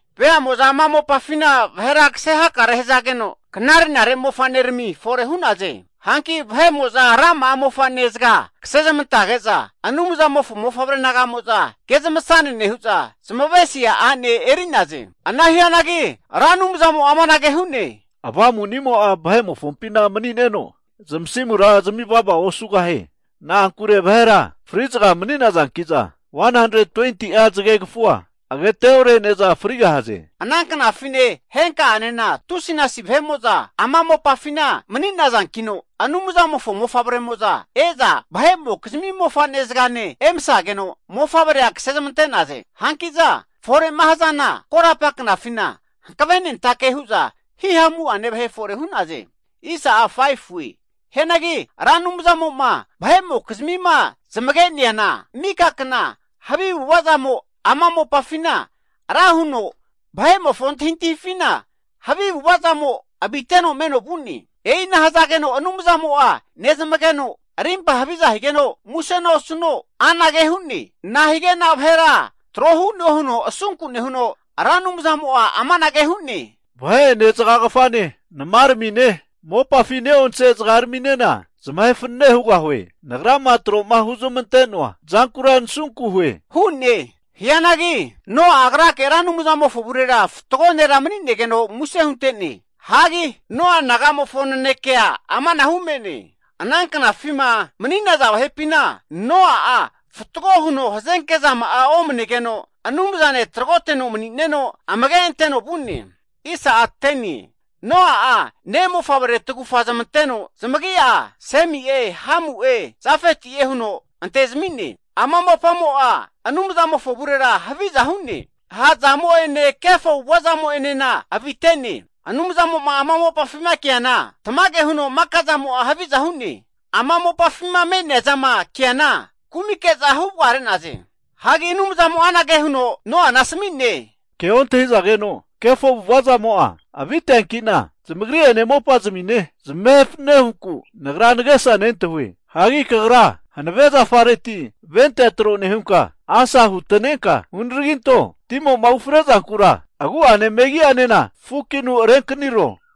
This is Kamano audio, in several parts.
Veamo'za ama mopafina vahera kase hakare hazageno, knare'nare mofa'nerami fore hu'naze. Hanki vahe'mo'za rama'a mofane zaga kasezmantage'za, Anumzamofo mofavre naga'mo'za ke zamasane nehu'za zamavesia a'ne eri'naze. Ana hianagi Ra Anumzamo'a amanage hu'ne, Avamunimo'a vahe'mofompina mani'neno zamasimura zami vava osugahie. Na'ankure vahera fri'zaga mani'nazanki'za, 120'a zagegafua agateore'neza frigahaze. Ana knafine henka'anena tusinasi vahe'mo'za ama mopafina mani'nazankino, Anumzamofo mofavremo'za e'za vahe'mokizmi mofane zagane emasageno mofavrea kasezmante'naze. Hanki'za fore'ma hazana korapa knafina hankavenentake hu'za hihamu'ane vahe fore hu'naze. Hianagi Ra Anumzamo'ma vahe'mokizmima zamage'neana, mika kna havi avu'avazamo ama mopafina ra huno vahe'mofo antahi antahifina, havi avu ava'zamo aviteno meno vu'ne. E'ina nehazageno Anumzamo'a nezamageno rimpa haviza higeno muse osuno, nahige'na vahera trohu'noe huno asunke nehuno, Ra Anumzamo'a amanage hu'ne, Vahe'ene, zagagafane, namaramine, mopafi ne'onse zagarami'nena zamahe fanane hugahue. Nagrama tro'ma huzmante'noa zankura nasunku hue hu'ne. Hianagi Noa'a agrake Ra Anumzamofo avurera fatgo nera mani'negeno muse hunte'ne. Hagi Noa nagamofo nanekea amanahu me'ne. Ana knafima mani'naza vahepina Noa'a fatgo huno hazenke'zama'a omanegeno Anumzane tragoteno mani'neno amage anteno vu'ne. Noa'a ne' mofavre tagufa zamanteno zamagi'a Semi'e, Hamu'e, Jafeti'e huno antezmi'ne. Ama mopamo'a Anumzamofo avurera haviza hu'ne, ha' zamo'ene, kefo avu'avazamo enena avite'ne. Anumzamo'ma ama mopafima ke'neana, tamage huno makazamo'a haviza hu'ne, ama mopafima me'neazama keana kumike'za huvagare'naze. Hagi Anumzamo'a anage huno Noana asmi'ne, Ke ontahizageno kefo avu'ava zamo'a aviteankina zamagri'ene mopazimine zamahe fanane huku Nagra nagesa nentahue. Hagi kagra hanave zafareti ra ventea tro nehunka, asa hutanenka hunaraginto. Timo'ma ufre'zankura agu'ane megi'anena fukinu renkaniro.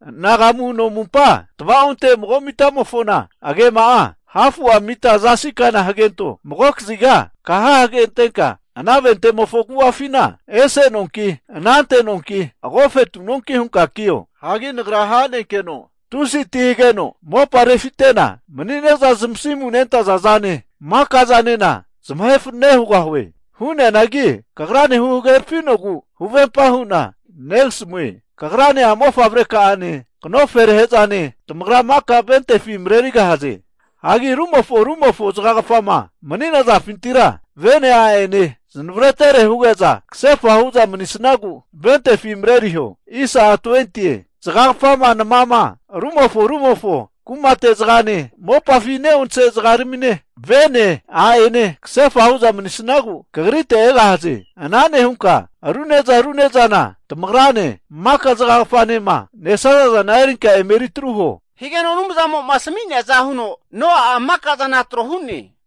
anagamu no amumpa tvaonte mago mitamofona agema'a hafu'a mita zasikana hagento. Magokaziga kaha hagentenka, ana ventemofo agu'afina ese nonki, anante nonki, agofetu nonki hunka kio. Hagi Nagra ha'nenkeno tusi'a ti hageno mopa refitena mani'ne'za zamasimu nentaza zane, maka'zanena zamahe fanane hugahue. Hu'neanagi kagrane huhagerafinugu huvempa hu'na negasamue. Kagrane a'mofavre ka'ane knoferahe'zane tamagra maka ventefi marerigahaze. Hagi rumofo rumofo zagagafama mani'nazafintira vene, a'ene zamavaretere huge'za kahefa hu'za mani'sagu ventefi mareriho. Zgagafama nama, rumofo rumofo kumate zagane, mopafi ne'onse zagarmine, vene a'ene kasefa hu'za manisnagu kagrite egahaze. Ana nehunka aru ne'za aru ne'zana, tamagrane maka zagagafanema nesazazana erinka eme eritru huo. Higeno Anumzamo'ma asmi'neaza huno Noa'a maka'zana tro hu'ne.